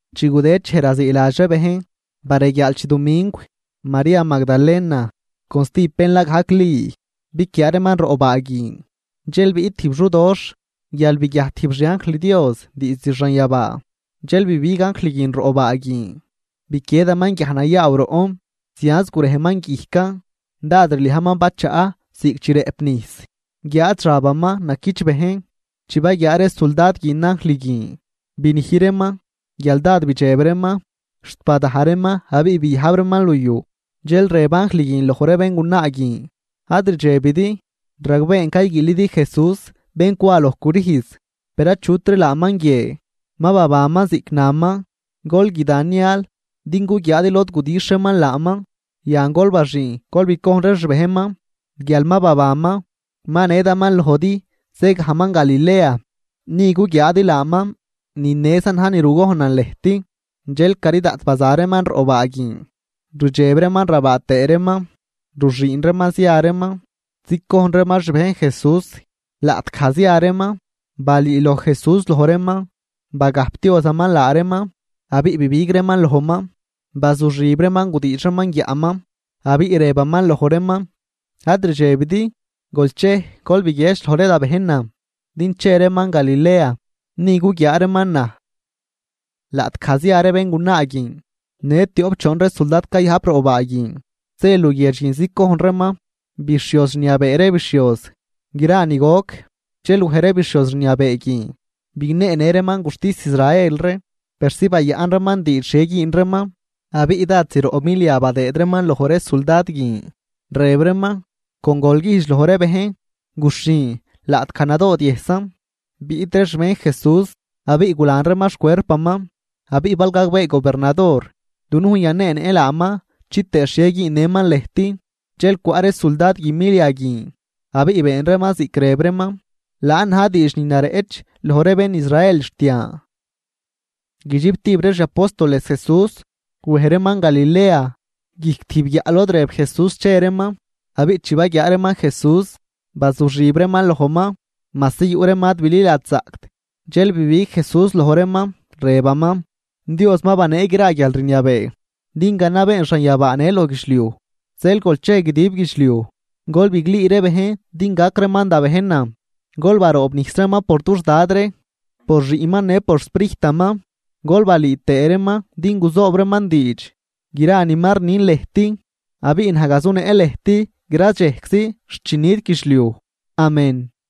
Chi gudëd dxej raziiladx ree bejn, bareguiaal chidumingw, María Magdalena con stijb bén la gajc Li biquiaa reeman roꞌ baa guin. Dxel biꞌt tijb xudoxh, guial biguiajt tijb xianjl Dios diizd xanyabaa, dxel bibig anjl guin roꞌ baa guin biquiedaman guiaj nayaaw roꞌn, zianz gurejman guijcan. Dád rliajman bachaꞌ ziꞌc chi rëꞌp nijs, guiáad xabaman naquichbëjn. Chi baguiaa ree suldad guin anjl guin, binij reeman guial dád bidxeb reeman xt badaj reeman abiꞌ biyajb reeman luyuj. Dxel rëb anjl guin loj ree béngunaa guin: ―Ad rdxebidi, ragbeen cayguiilidi Jesús bén cwa loj crüjz. Per achutri laaman guie, ma babanman ziꞌc naman. Gol guida nial din guguiaadi lod gudixh reeman laaman. Yan, gol baxüün gol bicojn ree xbejnman guial ma babanman, ma nedaman lojdi zëgajman Galilea, ni guguiaadi laaman. Ni nezan na̱j ni rugojnan lëjt. Dxel cari daꞌt baza reeman roꞌ baa guin rdxeb reeman rabaa tëë reeman, ruxüün reeman zia reeman zicojn reeman xbejn Jesús. Laꞌtgaj zia reeman, balüüloj Jesús loj reeman, bagajpdiozaman laa reeman. Abiꞌ bibig reeman lojman, bazuxib reeman, gudiidx reeman guiaꞌman, abiꞌ rëbaman loj reeman: ―Ad rdxebidi. Gol chej, gol biguiedx loj ree da bejnan din che reeman Galilea, ni guguiaa reeman naj. Laꞌtgaj zia ree béngunaa guin, në tioꞌp choon ree suldad cayajp roꞌ baa guin zë luguiedx guin zicojn reeman bixhioz rniabee ree bixhioz gra ni goc. Dxel wej ree bixhioz rniabee guin bigneenë reeman guxtis Israel ree persi bayaꞌn reeman diidx xhie güün reeman. Abiꞌ dad zroꞌ milia badëëd reeman loj ree suldad guin, rëb reeman: ―Con gol güjdx loj ree bejn: “Guxhin laꞌtgaj nadoodyëjsan, biꞌt ree xbejn Jesús abiꞌ gulan reeman xcuerpaman.” Abiꞌ bal gagbee gobernador, dunujn yaneenëꞌ laaman chitëë xhie güünnëman lëjt. Dxel cwaꞌ ree suldad guin milia guin abiꞌ been reeman ziꞌc rëb reeman. Laan na̱j diidx ni nareꞌch loj ree bén Israel xt yan. Guidxiptib ree xi apóstoles Jesús, wej reeman Galilea, guijc tijb guiaꞌ lod rëb Jesús che reeman. Abiꞌ chi baguiaa reeman Jesús, bazuxib reeman lojman, majsi yuꞌ reeman ad bililadxzaꞌct. Dxel bibig Jesús loj reeman, rëbaman: ―Dios ma banee gra guialrniabee din ganabeen xanyabaa në loj guidxliuj. Zeel, gol chej guidib guidxliuj, gol biglüü ree bejn din gac reeman da bejnan. Gol baroobnijs reeman por dux Dad ree, por Xiꞌnman në por xSprijtaman, gol balüü tëë reeman din guzoob reeman diidx gra ni ma rnin lëjt. Abiꞌ naj gazunëꞌ lëjt gradxejczi xt chi nit guidxliuj. Amén.